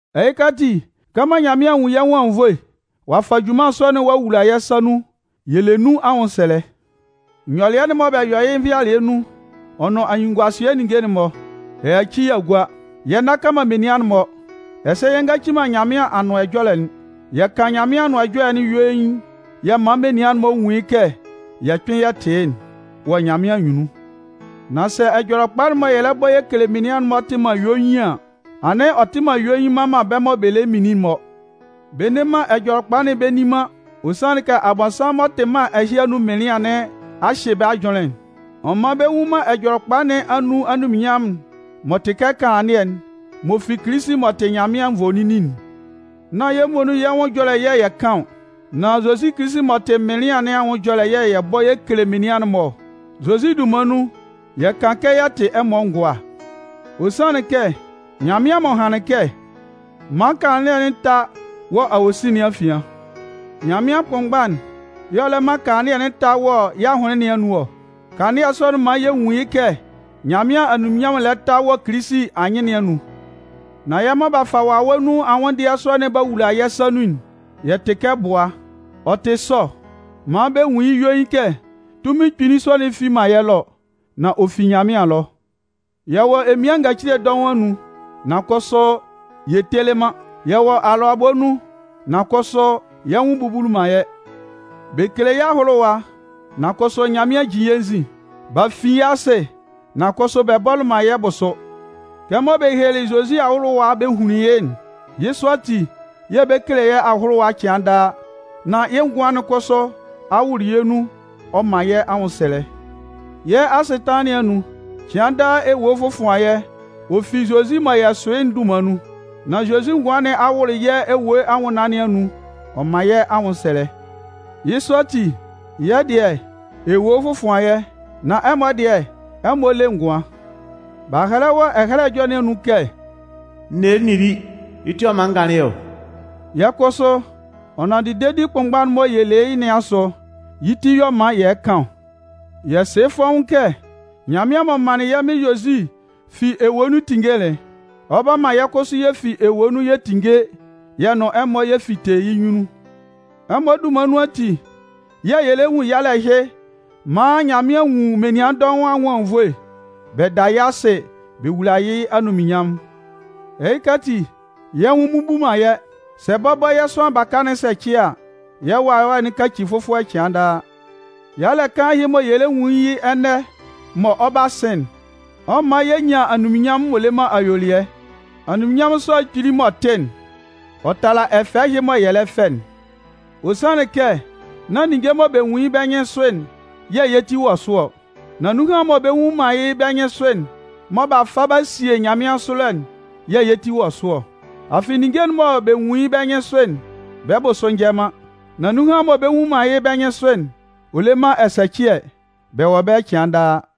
Ɛhɩka ati, kɛmɔ Nyanmɩan a nwun yɛ́ nwʋn anwunnvoe, ɔ'a fa junman sɔ'n ɔ'a wula yɛ́ sa nun, yɛ le nun anwʋnsɛlɛ. Nyɔlɩɛ'n mɔ bɛ yɔ yɩ́ nvɩalɩɛ nun ɔ nʋn anyunnunguasɩɛ ninnge'n-mɔ, y'a yaci y'a gua. Yɛ nnaka man menian'n-mɔ, ɛsɛ yɛ ngaci man Nyanmɩan Anʋan Ɛjɔlɛ'n. Yɛ kan Nyanmɩan Anʋan Ɛjɔlɛ'n yuein, yɛ man menian'n-mɔ nwun yɩ́ kɛ yɛ kpɩn yɛ tɩ yɩ́'n wɔ Nyanmɩan anyunnun. Nan sɛ Ɛjɔlɛkpa'n mɔ yɛ bɔ yɛ kele menian'n-mɔ tɩ man yuein an, anɩn ɔ tɩ man yuein man bɛ́ mɔ bɛ lɛ minlin'n-mɔ. Bɛ nne man Ɛjɔlɛkpa'n bɛ nni man, ɔ sanlɩn kɛ Abɔnsanmʋn m'ɔ tɩ mân ɛhɩ anun mɩnlɩan nɩn a hyɩ bɛ́ ajʋnlɩn'n. Ɔ man bɛ nnwun man Ɛjɔlɛkpa nɩn anun anunminnyanmʋn'n m'ɔ tɩ kɛ kanlannɩɛ'n m'ɔ fi Kilisi m'ɔ tɩ Nyanmɩan nvoninnin'n. Nán yɛ́ muonun yɛ́ nwʋn ɛjɔlɛ yɛ̂ yɛ kan ɔ. Nan Zozi Kilisi m'ɔ tɩ Mɩnlɩan nɩn anwʋn ɛjɔlɛ yɛ̂ yɛ bɔ yɛ kele menian'n-mɔ ɔ. Zozi dunman nun yɛ kan kɛ yɛ tɩ ɛmɔ ngʋa. Ɔ sanlɩn kɛ, Nyanmɩan m'ɔ hanlɩn kɛ: “Man kanlannɩɛ'n tá wɔ awosin nɩn afian!” Nyanmɩan kʋnmgba'n y'ɔ lɛ man kanlannɩɛ'n ta wɔ yɛ́ ahʋnlɩn'n-mɔ anun ɔ. Kanlannɩɛ sɔ'n man yɛ nwun yɩ́ kɛ Nyanmɩan anunminnyanmʋn'n lɛ ta wɔ Kilisi anyɩn nɩn anun. Nan yɛ́ mɔ b'a fa wawɛ nun anwʋndɩɛ sɔ'n b'a wula yɛ́ sa nun'n, yɛ tɩ kɛ bua. Ɔ tɩ sɔ maan bɛ nwun yɩ́ yuein kɛ tunmin kpili sɔ'n fi man yɛ́ ɛlɔ, nan ɔ fi Nyanmɩan ɛlɔ. Yɛ wɔ emian ngacile dɔʋn anun, nan kʋsʋ yɛ telɩ man. Yɛ wɔ alʋabɔ nun nan kʋsʋ yɛ́ nwʋn bubuli man yɛ́. Bɛ kele yɛ́ ahʋlʋwa, nan kʋsʋ Nyanmɩan jin yɛ́ nzin. B'a fin yɛ́ asɩ, nan kʋsʋ bɛ bɔlɩ man yɛ́ bʋsʋ. Kɛmɔ bɛ helelɩ Zozi ahʋlʋwa bɛ hunlin yɩ́'n, yɩ́ sɔ ati yɛ̂ bɛ kele yɛ́ ahʋlʋwa cɩan daa, nan yɩ́ ngʋan'n kʋsʋ a wʋlʋ yɛ́ nun ɔ man yɛ́ anwʋnsɛlɛ. Yɛ́ asɩtanlan nɩn anun, cɩan daa ewue fɔfʋan yɛ́ ɔ fi Zozi mɔ yɛ sʋ yɩ́'n dunman nun, nan Zozi ngʋan nɩn a wʋlʋ yɛ́ ewue anwʋnnaan nɩn anun ɔ man yɛ́ anwʋnsɛlɛ. Yɩ́ sɔ ati, yɛ́ dɩɛ, ewue fɔfʋan yɛ́, nan ɛmɔ dɩɛ, ɛmɔ le ngʋan. B'a hɛlɛ wɔ Ɛhɛlɛ Ɛjɔlɛ nɩn anun kɛ: “N nelɩ n nili, yɩ́ ti y'ɔ man n ganlɩn ɔ.” Yɛ̂ kʋsʋ ɔ nanndɩ dedi kʋnmgba'n mɔ yɛ le yɩ́ nɩn asʋ, yɩ́ ti y'ɔ man yɛ kan ɔ. Yɛ sɩ yɩ́ fɔ́ʋ́n kɛ Nyanmɩan m'ɔ manlɩn yɛ́ Mɩn Zozi fi ewue nun tinngelɩ'n, ɔ 'ba man yɛ́ kʋsʋ yɛ fi ewue nun yɛ tinnge yɛ nʋn ɛmɔ yɛ fite yɩ́ nyunnun. Ɛmɔ dunman nun ati yɛ̂ yɛ lɛ nwun yalɛ ɛhɩ maan Nyanmɩan nwun menian dɔʋn anwʋn anwunnvoe, bɛ da yɩ́ asɩ bɛ wula yɩ́ anunminnyanmʋn. Ɛhɩka ati, yɛ́ nwʋn mmubu man yɛ́. Sɛ bɔbɔ yɛ́ sʋanlan baka'n sɛcɩ a, yɛ́ wawɛ'n kaci fʋfɔlɛ cɩan daa. Yalɛ kaan ɛhɩ mɔ yɛ lɛ nwun yɩ́ ɛnɛ mɔ ɔ 'ba sɩn'n, ɔ 'man yɛ nyan anunminnyanmʋn m'ɔ le man ayuelɩɛ. Anunminnyanmʋn sɔ'n kpili m'ɔ tɩ'n, ɔ tala ɛfɛ ɛhɩ mɔ yɛ lɛ fɛ'n. Ɔ sanlɩn kɛ nán ninnge mɔ bɛ nwun yɩ́ bɛ́ nyɩnsʋ'n yɛ̂ yɛ́ ti wɔ sʋ ɔ, nan nunhan mɔ bɛ nnwun man yɩ́ bɛ́ nyɩnsʋ'n, mɔ b'a fa b'a sie yɛ́ nyanmɩansʋ ɛlɔ'n yɛ̂ yɛ́ ti wɔ sʋ ɔ. Afɩ ninnge'n mɔ bɛ nwun yɩ́ bɛ́ nyɩnsʋ'n, bɛ́ bʋsʋ njɛ man. Nan nunhan mɔ bɛ nnwun man yɩ́ bɛ́ nyɩnsʋ'n, ɔ le man ɛsɛcɩɛ. Bɛ wɔ ɛbɛlɛ cɩan daa.